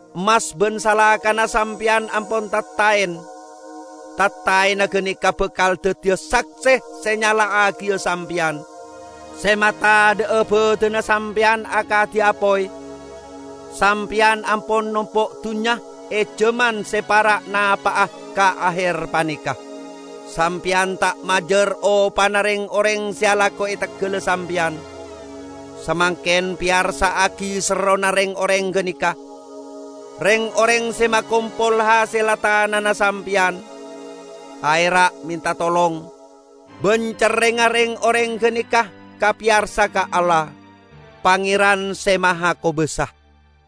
Emmas ban salakana sampeyan ampon tattaen. Tattaenna ganeka bakal daddiya sakse se nyala'agiya sampeyan, se matadha'a badanna sampeyan akadi apoy. Sampeyan ampon nompo' dunnya e jaman se para' napa'a ka aher paneka. Sampeyan ta' majar opana reng-oreng se alako e teggalla sampeyan. Samangken peyarsa'agi serrona reng-oreng ganeka! Reng-oreng se makompol hasella tanana sampeyan, aera' menta tolong, ban cerrengnga reng-oreng ganeka kapeyarsa ka Allah, Pangeran Se Mahakobasa.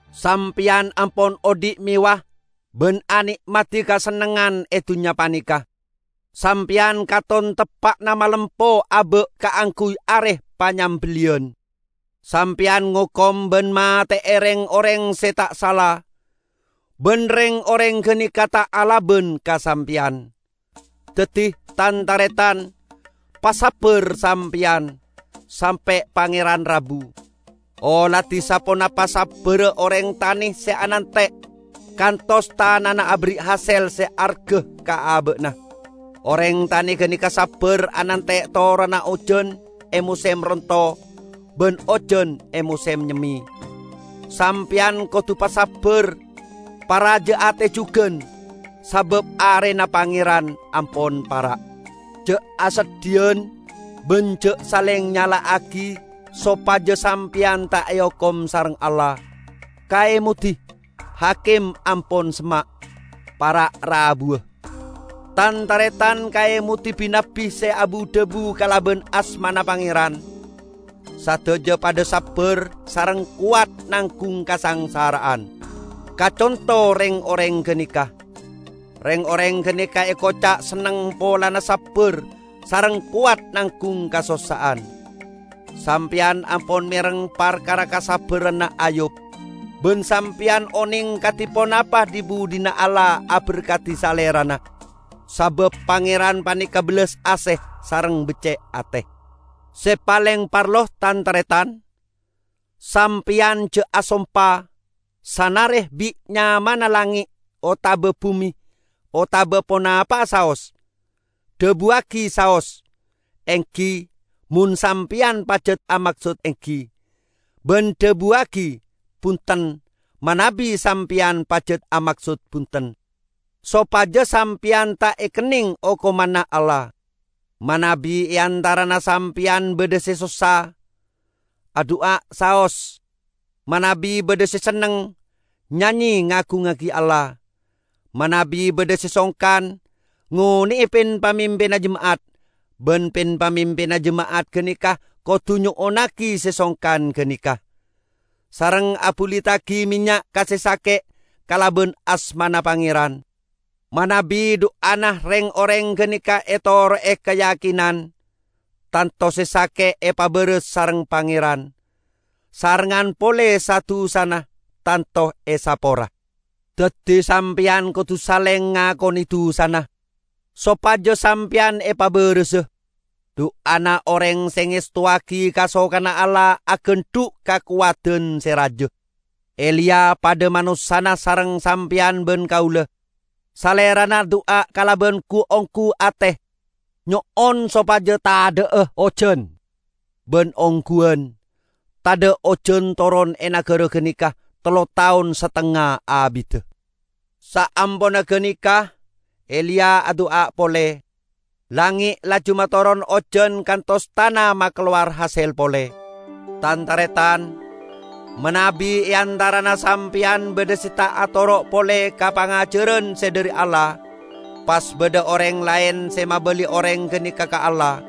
Sampeyan ampon odhi' mewah ban ane'madi kasennengngan e dunnya paneka. Sampeyan katon teppa'na malempo aba' kaangguy are panyambelliyan. Sampeyan ngokom ban mate'e reng-oreng se ta' sala, ban reng-oreng ganeka ta' alaban ka sampeyan. Daddi, Tan-taretan, pasabbar sampeyan, sampe' Pangeran rabu. Oladi saponapa sabbarra oreng tane se anante' kantos tanana aberri' hasel se arga ka aba'na. Oreng tane ganeka sabbar anante' toronna ojan e mosem ronto ban ojan e mosem nyemme. Sampeyan kodu pasabbar paraja ate jugan, sabab Arena Pangeran ampon para'. Ja' aseddhiyan ban ja' saleng nyala'agi sopaja sampeyan ta' eokom sareng Allah. Kaemodi! Hakim ampon semma', para' rabuwa. Tan-taretan, kaemodi bi-nabbi se abu-dhabu kalaban asmana Pangeran, sadaja padha sabbar sareng kowat nanggung kasangsara'an. Kaconto reng-oreng ganeka. Reng-oreng ganeka ekoca' senneng polana sabbar sareng kowat nanggung kasossa'an. Sampeyan ampon mereng parkara kasabbaranna Ayyub, ban sampeyan oneng kadi ponapa dhi-budhina Allah aberkadi salerana. Sabab Pangeran paneka bellas ase sareng becce' ate. Se paleng parlo tan-taretan: Sampeyan ja' asompa, sanare bit nyamana langnge' otaba bume otaba ponapa'a saos. Dhabuwagi saos "enggi" mon sampeyan pajat amaksod enggi, ban dhabuwagi "bunten" manabi sampeyan pajat amaksod bunten. Sopaja sampeyan ta' ekenneng okomanna Allah. Manabi e antarana sampeyan badha se sossa, adu'a saos. Manabi badha se senneng, nyanye ngagungngagi Allah. Manabi badha se songkan, ngone'e pin-pamimpinna jema'at. Ban pin-pamimpinna jema'at ganeka kodu nyo'onnagi se songkan ganeka, sareng abuliddagi mennya' ka se sake' kalaban asmana Pangeran. Manabi du'ana reng-oreng ganeka etoro'e kayakinan, tanto se sake' epabaras sareng Pangeran, sarengngan pole sa-dusana tanto esapora. Daddi sampeyan kodu saleng ngakone dusana, sopaja sampeyan epabarasa. Du'ana oreng se ngestowagi kasokanna Allah agandhu' kakowadan se raja. Eliya padha manossana sareng sampeyan ban kaula. Salerana adu'a kalaban gu-onggu ate, nyo'on sopaja tadha'a ojan; ban ongguwan, tadha' ojan toron e nagara ganeka tello taon satengnga abidda. Saamponna ganeka Eliya adu'a pole, langnge' laju matoron ojan kantos tana makalowar hasel pole. Tan-taretan! Manabi e antarana sampeyan badha se ta' atoro' pole ka pangajaran se dhari Allah, pas badha oreng laen se mabali oreng ganeka ka Allah,